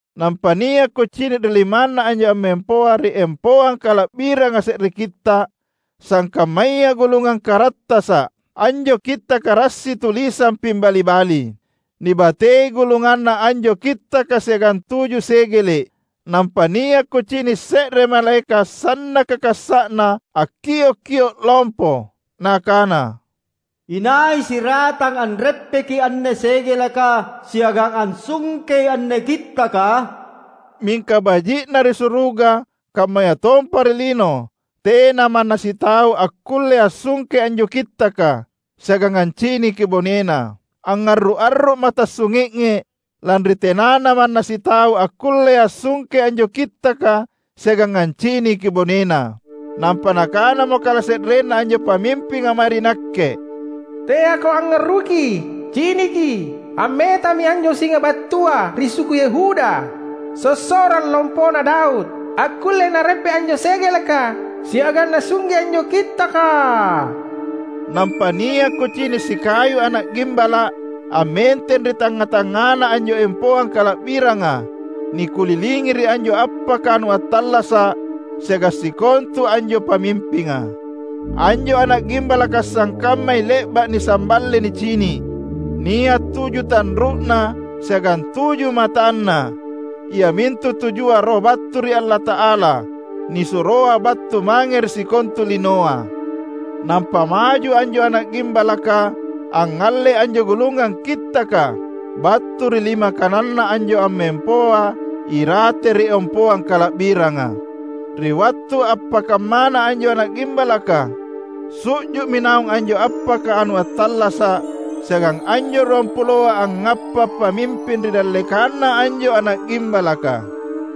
Nampa nia’ kucini’ ri limanNa anjo ammempoa ri empoang kala’biranga se’re kitta’, sangkammaya gulungang karattasa’. Anjo kittaka rassi tulisang pimbali-bali. Nibatei gulunganna anjo kittaka siagang tuju segele’. Nampa nia’ kucini’ se’re malaeka’ sannaka kassa’na akkiok-kio’ lompo nakana, "Inai siratang anreppeki anne segeleka siagang ansungkei anne kittaka?" Mingka baji’ na ri suruga kammayatompa ri lino tena manna sitau akkulle ansungkei anjo kittaka, siagang anciniki bonena. Angngarru’-arru’ma’ tassunge’nge’ lanri tenana manna sitau akkulle ansungkei anjo kittaka siagang anciniki bonena. Nampa nakanamo kalase’renna anjo pamimpinga mae ri nakke, "Teako angngarruki! Ciniki! Ammetami anjo singa battua ri suku Yehuda, sossorang lompona Daud. Akkullei Nareppe’ anjo segeleka siagang Nasungke anjo kittaka." Nampa nia’ kucini’ sikayu Ana’ Gimbala’ ammenteng ri tangnga-tangngana anjo empoang kala’biranga nikulilingi ri anjo appaka anu attallasa’ siagang sikontu anjo pamimpinga. Anjo Ana’ Gimbalaka sangkammai le’ba’ nisamballe nicini’. Nia’ tuju tanru’na siagang tuju matanna: iamintu tujua roh battu ri Allata’ala, nisuroa battu mange ri sikontu linoa. Nampa maju anjo Ana’ Gimbalaka angngallei anjo gulungang kittaka battu ri lima kananNa anjo ammempoa irate ri empoang kala’biranga. Ri wattu appakammana anjo Ana’ Gimbalaka, su’ju’mi naung anjo appaka anu attallasa’ siagang anjo ruampuloa angngappa’ pamimping ri dallekanNa anjo Ana’ Gimbalaka.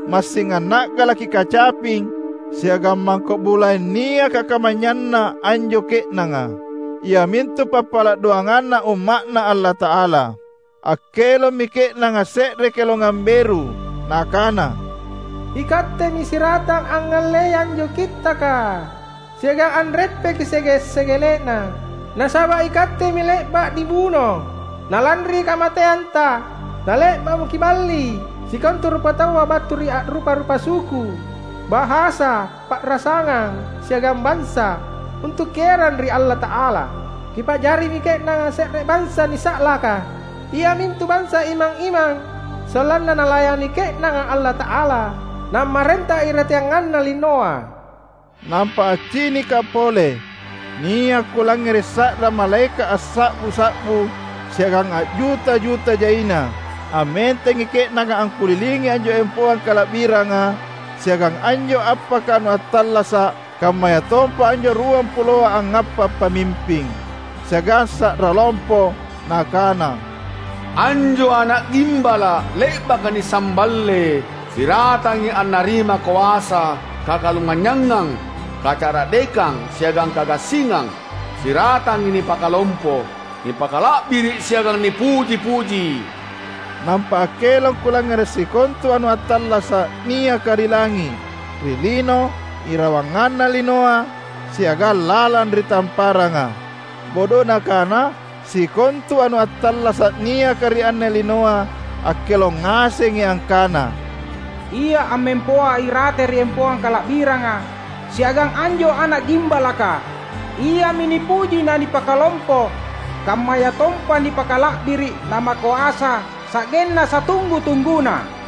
Massing anna’galaki kacaping siagang mangko’ bulaeng niaka kamanynyanna anjo ke’nanga, iamintu pappala’ doanganna Umma’Na Allata’ala. Akkelommi ke’nanga se’re kelongang beru nakana: "IKattemi siratang angngallei anjo kittaka, siagang anreppeki sege’-segele’na. Nasaba’ Ikattemi le’ba’ nibuno, na lanri kamateanTa, na le’ba’mo Kiballi sikontu rupataua battu ri a’rupa-rupa suku, bahasa, pa’rasangang, siagang bansa, untu’ Kierang ri Allata’ala. Kipa’jarimi ke’nanga se’re bansa nisa’laka iamintu bansa imang-imang sollanna nalayani ke’nanga Allata’alata, nammarenta irateanganna linoa." Nampa accinikka’ pole. Nia’ kulangngere’ sa’ra malaeka’ assa’bu-sa’bu siagang a’juta-juta jaina! Ammentengi ke’nanga angkulilingi anjo empoang kala’biranga siagang anjo appaka anu attallasa’ kammayatompa anjo ruampuloa angngappa’ pamimping. Siagang sa’ra lompo, nakana, "Anjo Ana’ Gimbala’ le’baka nisamballe, siratangi annarima koasa, kakalumanynyangang, kacara’dekang siagang kagassingang; siratangi nipakalompo, nipakala’biri’ siagang nipuji-puji!" Nampa akkelong kulangngere’ sikontu anu attallasa’ niaka ri langi’, ri lino, irawanganna linoa, siagang lalang ri tamparanga; bodona kana sikontu anu attallasa’ niaka ri anne linoa akkelong ngasengi angkana, "Ia ammempoa irate ri empoang kala’biranga, siagang anjo Ana’ Gimbalaka, Iami nipuji na nipakalompo, kammayatompa nipakala’biri’ na makoasa, sa’genna satunggu-tungguna!"